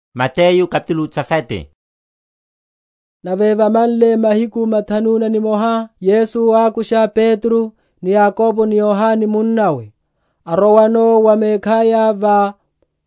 Nchichimiho na Yesu. Nave vamanle mahiku mathanu na nimoha, Yesu ákusha Petro, ni Yakobo, ni Yohane munnawe, arowano va mekhaya va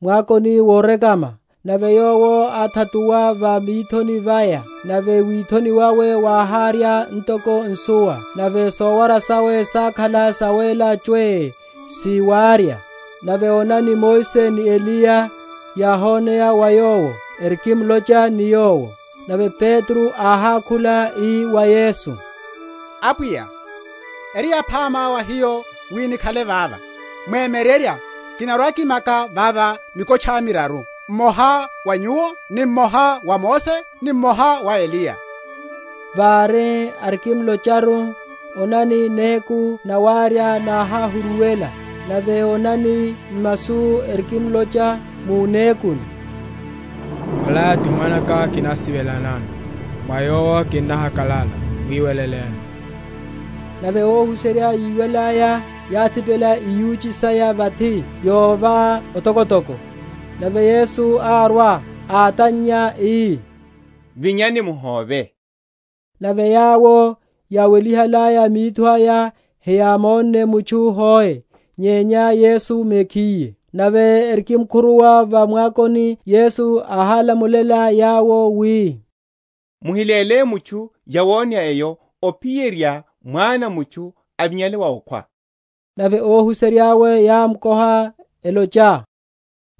mwakoni worekama: nave Yowo áthatuwa va mithoni vaya: nave withoni wawe wáhárya ntoko nsuwa, nave sowara sawe sákhala sawéla chwee si wárya. Nave onani, Mose ni Eliya yáhoneya wa Yawo, erikimlocha ni Yowo. Nave Petro áhákhula, ii wa Yesu, Apwiya, eri yaphama wa hiyo wi nikhale vava: Mwemyererya kinarwa‐kimaka vava mikotcha miraru; mmoha wa Nyuwo, ni mmoha wa Mose, ni mmoha wa Eliya. Vári arikimlocharu, onani, néku nawárya náháhuruwela: nave onani, masu erikimlocha mu nékuni. Ola ti Mwanaka kinasive?-?lanano, mwa yowo kinnahakalala, mwiweleleni. Nave óhuserya yíwalaya, yáthipela iyuchi saya vathi, yova otokotoko. Nave Yesu árwa, átannya ii, Vinyani, muhóve. Nave yawo yáwelihalaya mitho aya heyámonne mutchu hoe, nyenya Yesu mekhiye. Nave erikimkhuruwa va mwakoni, Yesu áhálamulela yawo wi, Muhiléle mutchu yawoneya eyo, ophiyerya Mwana a mutchu avinyale wa okhwa. Nave óhuserya’we yámkoha, elocha,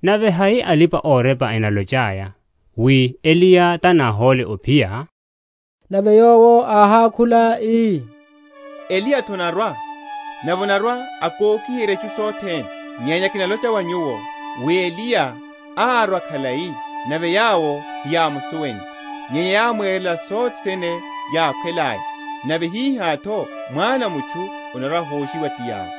Nave hai alipa‐orepa enalochaya wi Eliya tánáhole ophiya? Nave Yowo áhákhula, ii, Eliya’tho anarwa, nave anarwa‐akokiherya itchu sothene. Nyenya kinalocha wa nyuwo, wi Eliya árwa khalai, nave yawo heyámsuwenle, nyenya yámwerela sothene yákhwelaya. Nave hihá’tho Mwana a mutchu anarwa‐ahoshiwa ti yawo.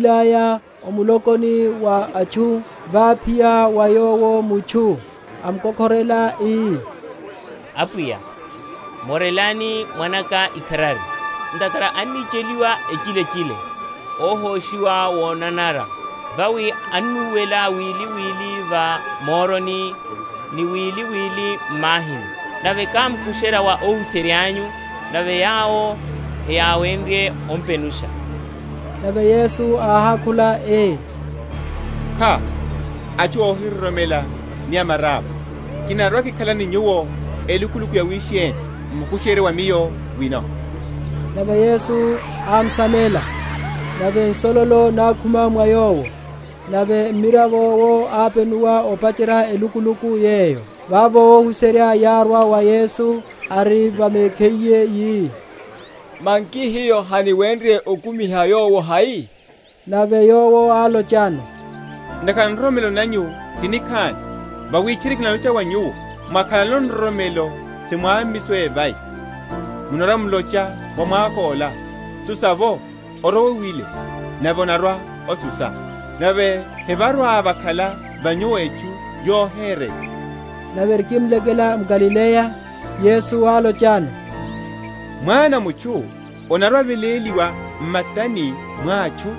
Nave yawo yárwilaya o mulokoni wa atchu, váphiya wa Yowo mutchu, amkokhorela, ii, Apwiya, Morelani mwanaka ikharari; ntakhara anicheliwa echilechile, óhoshiwa wonanara: vawi annúwela wili wili va moroni, ni wili wili m’mahini. Nave kámkusherya wa óhuserya’nyu, nave yawo heyáwenrye ompenusha. Nave Yesu áhákhula ii, Kha, atchu óhiroromela ni amarapwa, kinarwa‐kikhala ni nyuwo elukuluku yawisheni? mumkusherye wa Miyo wino. Nave Yesu ámsamela; nave nsololo nákhuma mwa yowo: nave mmiravo’wo ápenuwa opacherya elukuluku yeyo. Vavo óhuserya yárwa wa Yesu, ari va mekhiye, yi, Manki hiyo haniwenrye okumiha yowo hai? Nave Yowo álochano, Ntakhara nroromelo nanyu ti nikhani: vawi tchiri kinalocha wa nyuwo, Mwakhalano nroromelo si mwámmiso a evai, munarwa‐mulocha wa mwako’la, Susa’vo orowe wile; nave onarwa‐osusa; nave hevarwa‐vakhala va nyuwo etchu yohereya. Nave erikimlekela m’Galileya, Yesu álochano, Mwana a mutchu anarwa‐aveléliwa m’matani mwa atchu;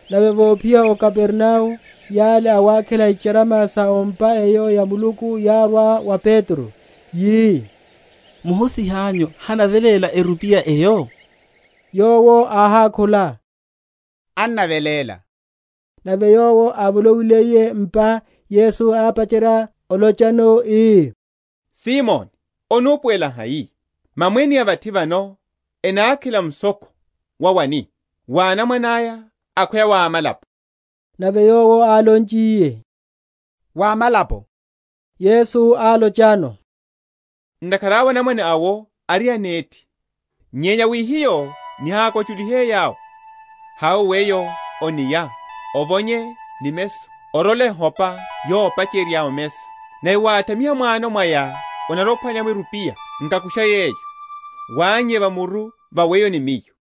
Nave vophiya o Kapernao yale awákhela icharama sa o’mpa eyo ya Muluku yárwa wa Petro, yi, Muhusiha’nyu hanaveléla erupiya eyo? Yowo áhákhula, Annaveléla. Nave yowo ávolowiliye m’pa, Yesu ápacherya olochano, ii, Simoni, onupuwela hai? mamwene a vathi vano enákhela mushokho wa wani? wa anamwane aya, akhweya wa amalapo? Nave yowo álonchiye, Wa amalapo, Yesu álochano, Ntakhara awe anamwane awo ari anethi. Nyenya wi hiyo nihákwa?-?chulihe yawo, hawe weyo o’nia, ovonye nimeso, orole ehopa yopacherya omesa; nave wáthamiha m’wano mwaya onarwa‐ophwanya’mo erupiya: nkakusha yeyo, wánnye va muru va weyo ni Miyo.